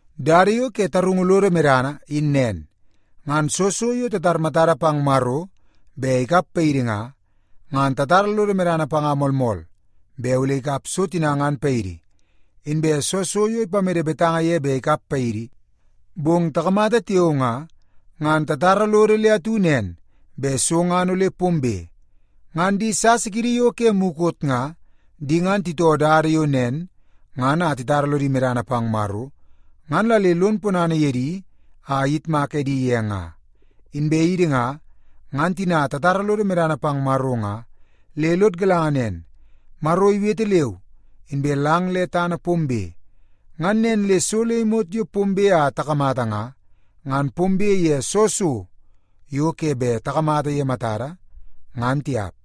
Dada yo ke tarungu lodo medana in nen. Ngan soo so yo tatar matada pang Maro bet ikap paidi nga, ngan tatara lodo medana panga moolmool bet ole ikap so tina ngan paidi. Inbe soo so yo ipamede betanga ye bet ikap paidi, bong takamata tiao nga, ngan tatara lodo le atu nen bet so ngan ole pombe. Ngan di sasa kiidi yo ke mukot nga, di ngan titoo dada yo nen ngan a titara lodi medana pang Maro, ngan la le lon ponana ye di a iyitmak edi ye nga. Inbe idi nga, ngan tina tatara lodo medana pang Maro nga, le lod galanga nen: Maro iwete leu, inbe lang le tana pombe. Ngan nen le so le imot yo pombe a takamata nga, ngan pombe ye soo so yo ke bet takamata ye matada, ngan tiap.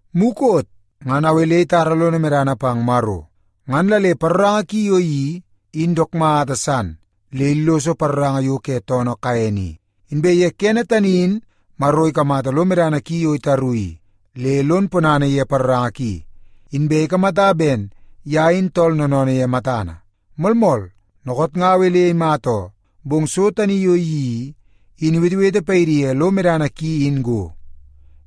Mukot ngan Awel itara lono medana pang Maro, ngan la le paroranga ki yo iyeii in dook mata san le illoso paroranga yo ke toonoo Kaen i. Inbe ye kene tani in Maro ikamata lo medana ki yo itaru i, le lon ponana ye paroranga ki, inbe ikamata ben ye in tool noonoonoo ye matana. Moolmool, dookoot nga Awel imata oo, bong so tani yo iyeii i, in iwetewete paidi ye lo medana ki in go.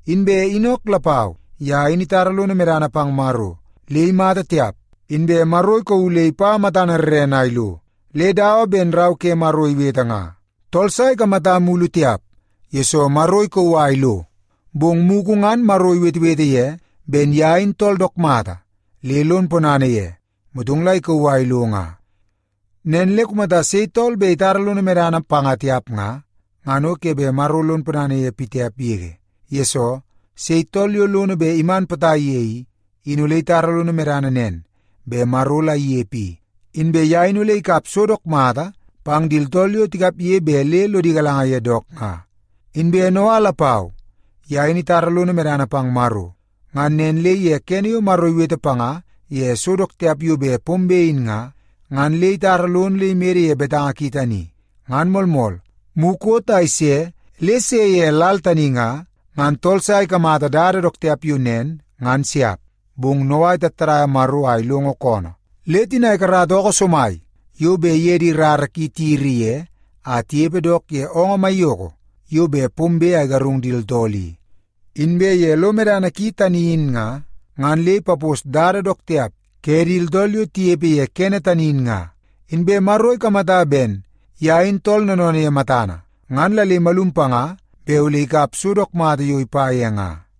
Inbe Inok lapau, ye in itara lono medana pang Maro. Le imata tiap, inbe Maro ikauu le ipa matana rrene a ilo. Le dawa ben Rau ke Maro iwete nga, “Tool sa ikamata mulu tiap, yesoo Maro ikauu a ilo.” Bong mugu ngan Maro iwetewete ye ben ye in tooltool dook mata le lon ponana ye, motong la ikauu a ilo nga. Nen le kumata sei tool bet itara lono medana panga tiap nga, ngan o ke bet Maro lon ponana ye pitiap yege. Yesoo, sei tool yo lono bet iman potai ye i, in ole itara lono medana nen bet Maro la inepe i, inbe ye in ole ikap so dook mata pang di tooltool yo tikapge bet le lodi galanga ye dook nga. Inbe Noa lapau, ye in itara lono medana pang Maro. Ngan nen le ye kene yo Maro iwete panga ye so dook tiap yo bet pombe in nga, ngan le itara lono le imede ye betanga ki tani. Ngan moolmool, mukot a ise le se ye lal tani nga, ngan tool sa ikamata dada dook tiap yo nen, ngan siap. Bong Noa itattadaia Maro a ilongo koonoo, le tina ikarata ookoo somai yo bet iye di rara ki tiyiri ye a tinepe dook ye oongoo maiyoko yo bet pombe a igarung di tooltool i. Inbe ye lo medana ki tani in nga, ngan le ipapos dada dook tiap ke di tooltool yo tinepe ye kene tani in nga. Inbe Maro ikamata ben ye in tooltool noonoonoo ye matana, ngan la le imalum panga bet ole ikap so dook mata yo ipa ye nga.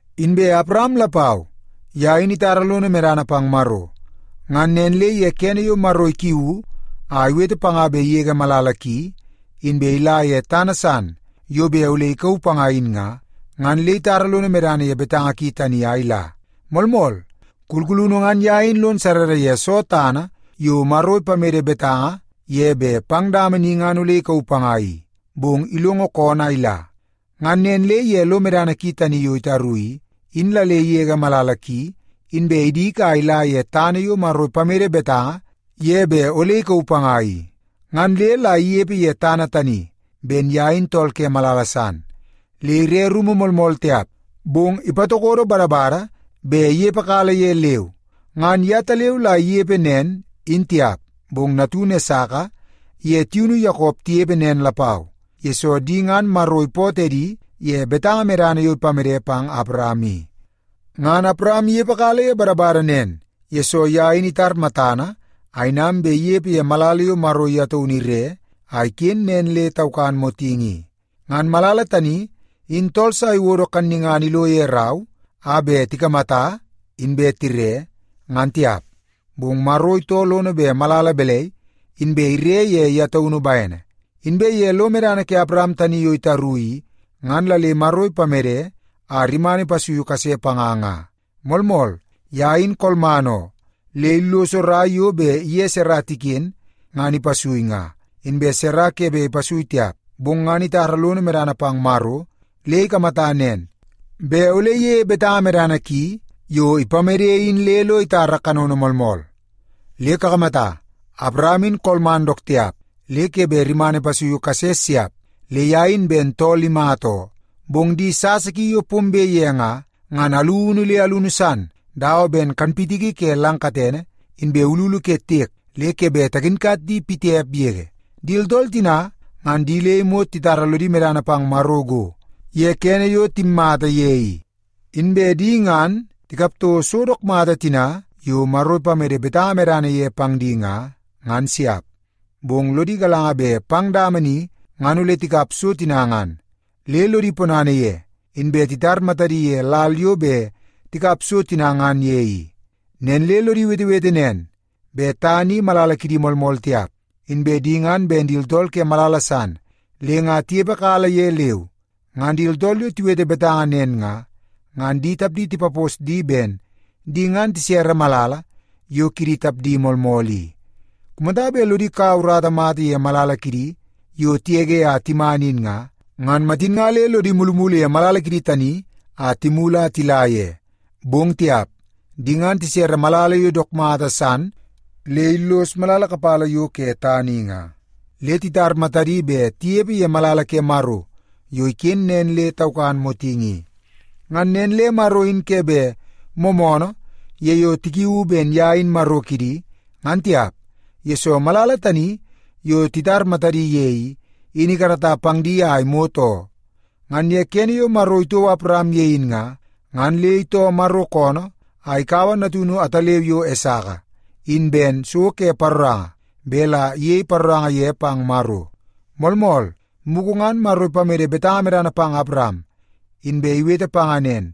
Inbe Awaram lapau, ye in itara lono medana pang Maro. Ngan nen le ye kene yo Maro ikiuu a iwete panga bet igege malala ki inbe ila ye tana san yo bet ole ikauu panga in nga, ngan le itara lono medana ye betanga ki tani a ila. Moolmool, kulkulunu ngan ye in lon sarrara ye soo tana yo Maro ipamede betanga ye bet pang dama ni ngan ole ikauu panga i, bong ilongo koonoo a ila. Ngan nen le ye lo medana ki tani yo itaru i, in la le igege malala ki inbe idik a ila ye tana yo Maro ipamede betanga ye bet ole ikauu panga i. Ngan le la inepe ye tana tani ben ye in tool ke malala san, le ire rumu moolmool tiap, bong ipatokodo badabada bet inepekala ye leu. Ngan yetaleu la inepe nen, in tiap, bong natunu Esaka iye tiunu Yakop tinepe nen lapau, yesoo di ngan Maro ipootoo edi ye betanga medana yo ipamede pang Awaram i. Ngan Awaram inepekala ye badabada nen, yesoo ye in itar matana a inam bet inepe ye malala yo Maro ye taunu ire a iken nen le taukan motingi i. Ngan malala tani in tool sa iwodo kannungana ilo ye rau a bet tikamata inbe tire, ngan tiap, bong Maro itoo lono bet malala balai, inbe ire ye ye taunu bene. Inbe ye lo medana ke Awaram tani yo itaru i, ngan la le Maro ipamede a rimana ipasui kase panga nga. Moolmool, ye in kolman oo, le illoso rai yo bet iye Sara tiken ngan ipasui nga, inbe Sara ke bet ipasui tiap. Bong ngan itara lono medana pang Maro le ikamata nen, bet ole iyeie betanga medana ki yo ipamede in le lo itara kanono moolmool. Le kakamata, Awaram in kolman dook tiap le ke bet rimana ipasuiu kase siap, le ye in ben tool imata oo. Bong di sasa ki yo pombe ye nga, ngan alunu le alunu san dawa ben kanpitiki ke lang katene, inbe ululu ke tiek le ke bet takinkat di pitiap yege. Di tooltool tina ngan di le imot titara lodi medana pang Maro go, ye kene yo timmata ye i. Inbe di ngan tikap toko so dook mata tina yo Maro ipamede betanga medana ye pang di nga, ngan siap, bong lodi galanga bet pang dama ni ngan ole tikap so tina ngan. Le lodi ponana ye, inbe titar matadi ye lal yo bet tikap so tina ngan ye i. Nen le lodi wetewete nen, bet tana i malala kidi moolmool tiap, inbe di ngan ben di tooltool ke malala san le nga tinepekala ye leu. Ngan di tooltool yo tiwete betanga nen nga, ngan di tapdi tipapos di ben di ngan tisere malala yo kidi tapdi moolmool i. Kumata bet lodi kaua urata mata ye malala kidi yo tigege a timan in nga, ngan matin nga le lodi mulumulu ye malala kidi tani a timulu a tila ye. Bong tiap! Di ngan tisere malala yo dook mata san le illos malala kapala yo ke tana i nga, le titar matadi bet tinepe ye malala ke Maro yo iken nen le taukan motingi i. Ngan nen le Maro in ke bet moomoonoo ye yo tikiuu ben ye in Maro kidi, ngan tiap, yesoo malala tani yo titar matadi ye i, in ikarata pang di a imot oo. Ngan ye kene yo Maro itouo Awaram ye in nga, ngan le itoo Maro koonoo a ikaua natunu ataleu yo Esaka in ben so ke paroranga bet la iyei paroranga ye pang Maro. Moolmool, mugu ngan Maro ipamede betanga medana pang Awaram, inbe iwete panga nen,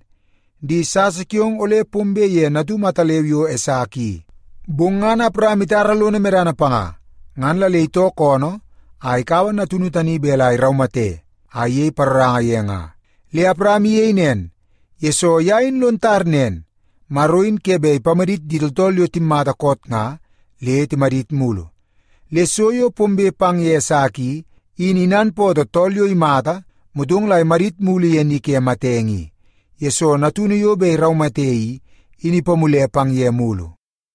“Di sasa kiong ole pombe ye natum ataleu yo Esaka i.” Bong ngan Awaram itara lono medana panga, ngan la le itoo koonoo a ikaua natunu tani bet la iraumate a iyei paroranga ye nga. Le Awaram iyei nen, yesoo ye in lon tar nen, Maro in ke bet ipamadit di tooltool yo timmata koot nga le timadit mulu. Le so yo pombe pang ye Esaka i, in inanpootoo tool yo imata motong la imadit mulu ye ni ke matenge i, yesoo natunu yo bet iraumate i, in ipamule pang ye mulu.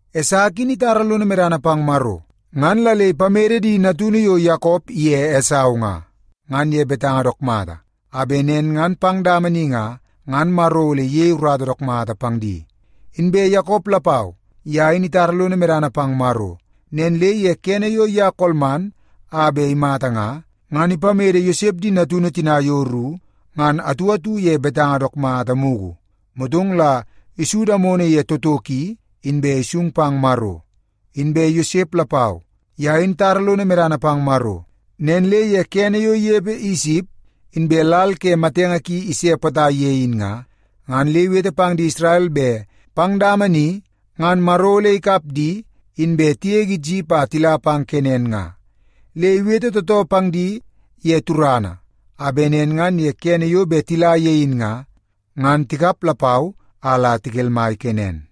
Esaka in itara lono medana pang Maro, ngan la le ipamede di natunu yo Yakop iye Esau nga, ngan ye betanga dook mata, a bet nen ngan pang dama ni nga, ngan Maro ole iyei urata dook mata pang di. Inbe Yakop lapau, ye in itara lono medana pang Maro. Nen le ye kene yo ye kolman a bet imata nga, ngan ipamede Yosep di natunu tina yo ru ngan atu atu ye betanga dook mata mugu. Motong la isu damono ye toto ki, inbe isung pang Maro. Inbe Yosep lapau, ye in itara lono medana pang Maro. Nen le ye kene yo inepe Isip inbe lal ke matenge ki ise potai ye in nga, ngan le iwete pang di Isrel bet pang dama ni ngan Maro ole ikap di, inbe tigege Isip a tila pang Kenan nga. Le iwete tootoo pang di ye turana, a bet nen ngan ye kene yo bet tila ye in nga, ngan tikap lapau a la tikelmai Kenen.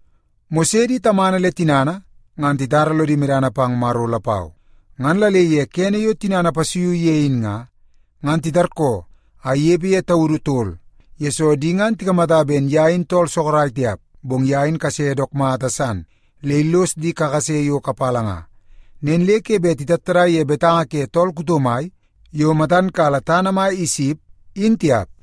Mose di tamana le tinana ngan titara lodi medana pang Maro lapau. Ngan la le ye kene yo tinana ipasuiu ye in nga, ngan titarkoo a inepe ye taudu tol, yesoo di ngan tikamata ben ye in tool sorok tiap, bong ye in kase dook mata san le illos di kakase yo kapala nga. Nen le ke bet titattadai ye betanga ke tool kuto mai yo matan kala tana mai Isip, in tiap.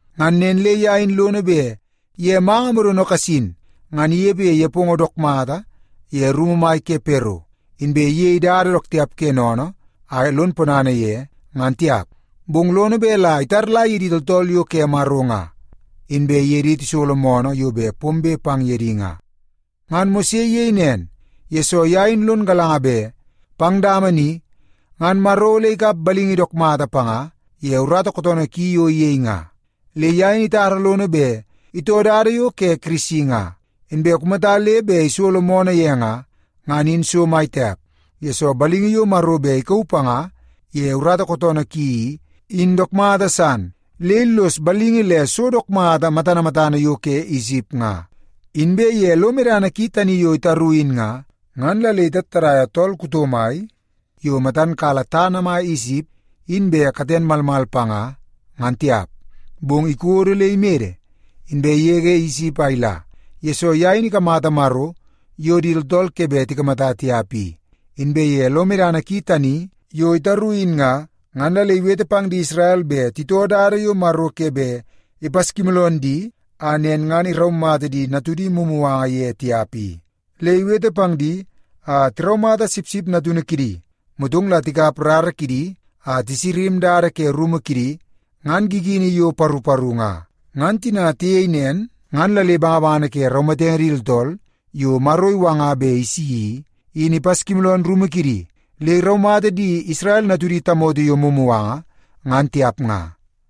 Ngan nen le ye in lono bet ye manga modono kasin, ngan inepe ye nepongo dook mata ye rumu mai ke Pero, inbe iyei dada dook tiap ke sennene a lon ponana ye, ngan tiap. Bong lono bet la itaula ye di tooltool yo ke Maro nga, inbe iye di tisolo moonoo yo bet pombe pang ye di nga. Ngan Mose iyei nen, yesoo ye in lon galanga bet pang dama ni, ngan Maro ole ikap balingi dook mata panga ye urata kootoonoo ki yo iyei nga. Le ye in itara lono bet itoo dada yo ke Kirisi nga, inbe kumata le bet isolo moonoo ye nga, ngan in so mai tiap, yesoo balingi yo Maro bet ikauu panga ye urata kootoonoo ki i, in dook mata san le illos balingi le so dook mata matana matana yo ke Isip nga. Inbe ye lo medana ki tani yo itaru in nga, ngan la le itattadaia tool kuto mai yo matan kala tana mai Isip in bet katen malmal panga, ngan tiap. Bong ikodo le imede, inbe igege Isip a ila, yesoo ye in ikamata Maro yo di tooltool ke bet tikamata tiap i. Inbe ye lo medana ki tani yo itaru in nga, ngan la le iwete pang di Isrel bet titoo dada yo Maro ke bet ipaskimooloon di a nen ngan iraumata di natudi mumuganga ye tiap i. Le iwete pang di a tiraumata sipsip natunu kidi, motong la tikap rara kidi a tisama dada ke rumu kidi ngan gigini yo paru paru nga. Ngan tina tiyei nen, ngan la le bangabangana ke raumatenge di tooltool yo Maro iwanga bet isi i, in ipaskimooloon rumu kidi, le iraumata di Isrel natudi tamoto yo mumuganga, ngan tiap nga.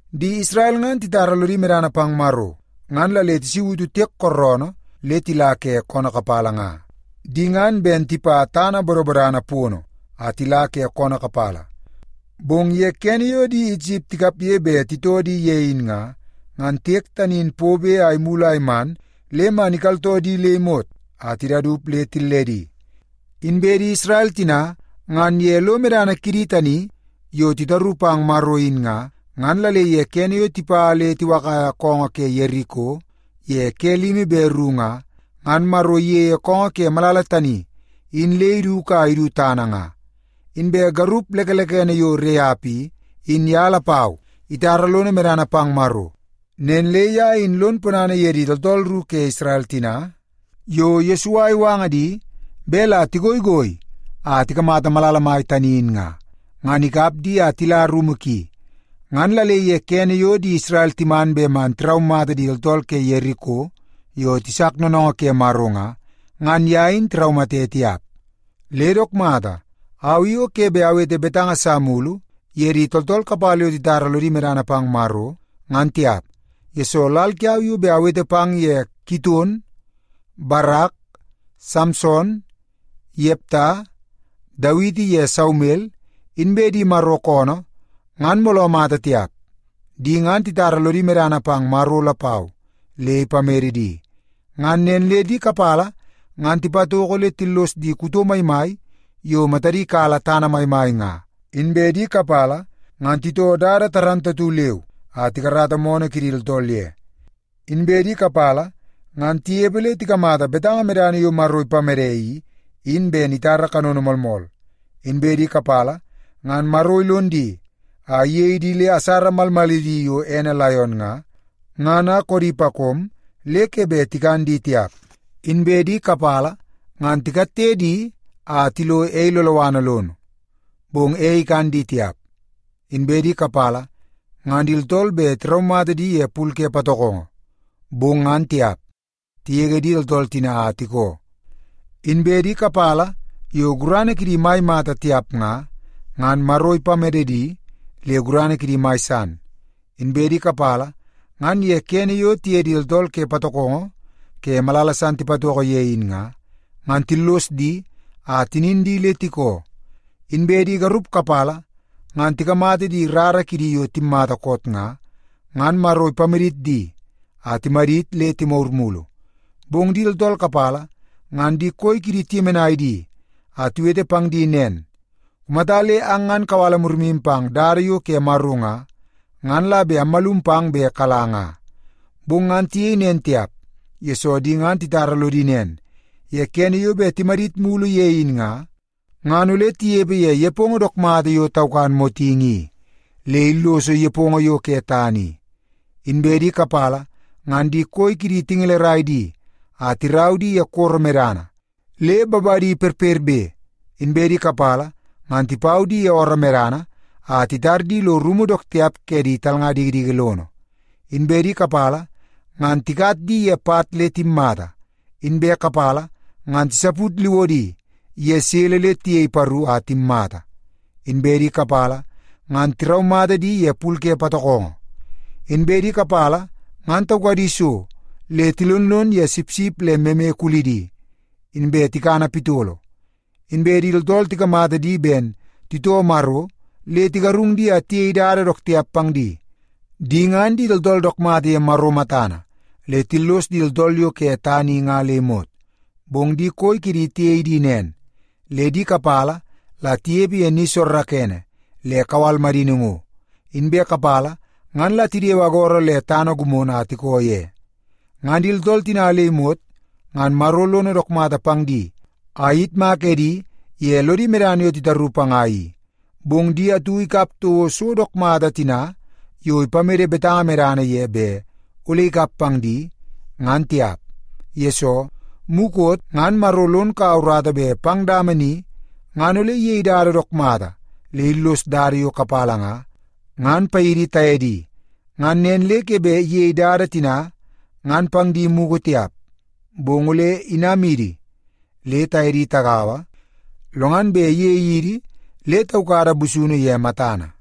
Di Isrel ngan titara lodi medana pang Maro, ngan la le tisautu tiek kooroonoo le tila ke koonoo kapala nga. Di ngan ben tipa tana bodobodana pono a tila ke koonoo kapala, bong ye kene yo di Isip tikapge bet titoo di ye in nga, ngan tiek tani in pobe a imulu a iman le man ikaltoo di le imot a tidaup le tilledi. Inbe di Isrel tina ngan ye lo medana kidi tani yo titaru pang Maro in nga, ngan la le ye kene yo tipa le tiwakaia koongoo ke Yeriko ye ke limi be ru nga, ngan Maro iyeie koongoo ke malala tani in le iduku a idu tana nga. Inbe garup lekelekene yo Reap i, in ye lapau itara lono medana pang Maro. Nen le ye in lon ponana ye di tooltool ru ke Isrel tina yo Yesua iwanga di bet la tigoigoi a tikamata malala mai tani in nga, ngan ikap di a tila rumu ki. Ngan la le ye kene yo di Isrel timan bet man tiraumata di tooltool ke Yeriko yo tisak noonoongoo ke Maro nga, ngan ye in tiraumate tiap. Le dook mata, au i o ke bet awete betanga sa mulu ye di tooltool kapala yo titara lodi medana pang Maro, ngan tiap, yesoo lal kiau yo bet awete pang ye Kiton, Barak, Samson, Yepta, Dawiti ye Saumel inbe di Maro koonoo ngan mooloo mata tiap. Di ngan titara lodi medana pang Maro lapau le ipamede di. Ngan nen le di kapala ngan tipatoko le tillos di kuto maimai yo matadi kala tana maimai nga. Inbe di kapala ngan titoo dada dook mata leu a tikarata moonoo kidi tooltool ye. Inbe di kapala ngan tinepe le tikamata betanga medana yo Maro ipamede i, in ben itara kanono moolmool. Inbe di kapala ngan Maro ilon di a iyei di asara malmalidi yo edi laion nga, ngan a koodi pakom le ke bet tikan di tiap. Inbe di kapala ngan tikatte di a tilo ei loloana lono, bong ei ikan di tiap. Inbe di kapala ngan di tooltool bet tiraumata di ye pul ke patokongo, bong ngan tiap. Tigege di tooltool tina a tikoo. Inbe di kapala yo gurana kidi mai mata tiap nga, ngan Maro ipamede di le gurana kidi mai san. Inbe di kapala ngan ye kene yo tiye di tooltool ke patokongo ke malala san tipatoko ye in nga, ngan tillos di a tinin di le tikoo. Inbe di garup kapala ngan tikamata di rara kidi yo timmata koot nga, ngan Maro ipamadit di a timadit le timagur mulu. Bong di tooltool kapala ngan di koi kidi tiyemenai di a tiwete pang di nen, “Kumata le ang ngan kawala murimu pang dada yo ke Maro nga, ngan la bet ammalum pang bet kala nga.” Bong ngan tiyei nen tiap, yesoo di ngan titara lodi nen, ye kene yo bet timadit mulu ye in nga, ngan ole tinepe ye nepongo dook mata yo taukan motingi i, le illoso nepongo yo ke tana i. Inbe di kapala ngan di koi kidi tingelerai di a tirau di ye koro medana le babadi perperbe. Inbe di kapala ngan tipau di ye ooroo medana a titar di lo rumu dook tiap ke di talnga dikidiki lono. Inbe di kapala ngan tikat di ye pat le timmata, inbe kapala ngan tisaput liwodi ye sele le tiyei paru a timmata. Inbe di kapala ngan tiraumata di ye pul ke patokongo. Inbe di kapala ngan taukadi so, le tilonlon ye sipsip le meme kulini, inbe tikana pitolo. Inbe di tooltool tikamata di ben titoo Maro, le tigarung di a tiyei dada dook tiap pang di. Di ngan di tooltool dook mata ye Maro matana, le tillos di tooltool yo ke tana i nga le imot. Bong di koi kidi tiyei di nen, le di kapala la tinepe ye ni soorookoonoo le kawal madini ngo, inbe kapala ngan la tidewe agoro le tana gimono a tiko ye. Ngan di tooltool tina le imot ngan Maro lono dook mata pang di a iyitmak edi ye lodi medana yo titaru panga i, bong di atu ikap toko so dook mata tina yo ipamede betanga medana ye bet ole ikap pang di, ngan tiap. Yesoo, mukot ngan Maro lon kaua urata bet pang dama ni ngan ole iyei dada dook mata le illos dada yo kapala nga, ngan paidi taye di. Ngan nen le ke bet iyei dada tina ngan pang di mugu tiap, bong ole tinamidi le taye di tagaua, lo ngan bet iyei idi le taukada busunu ye matana.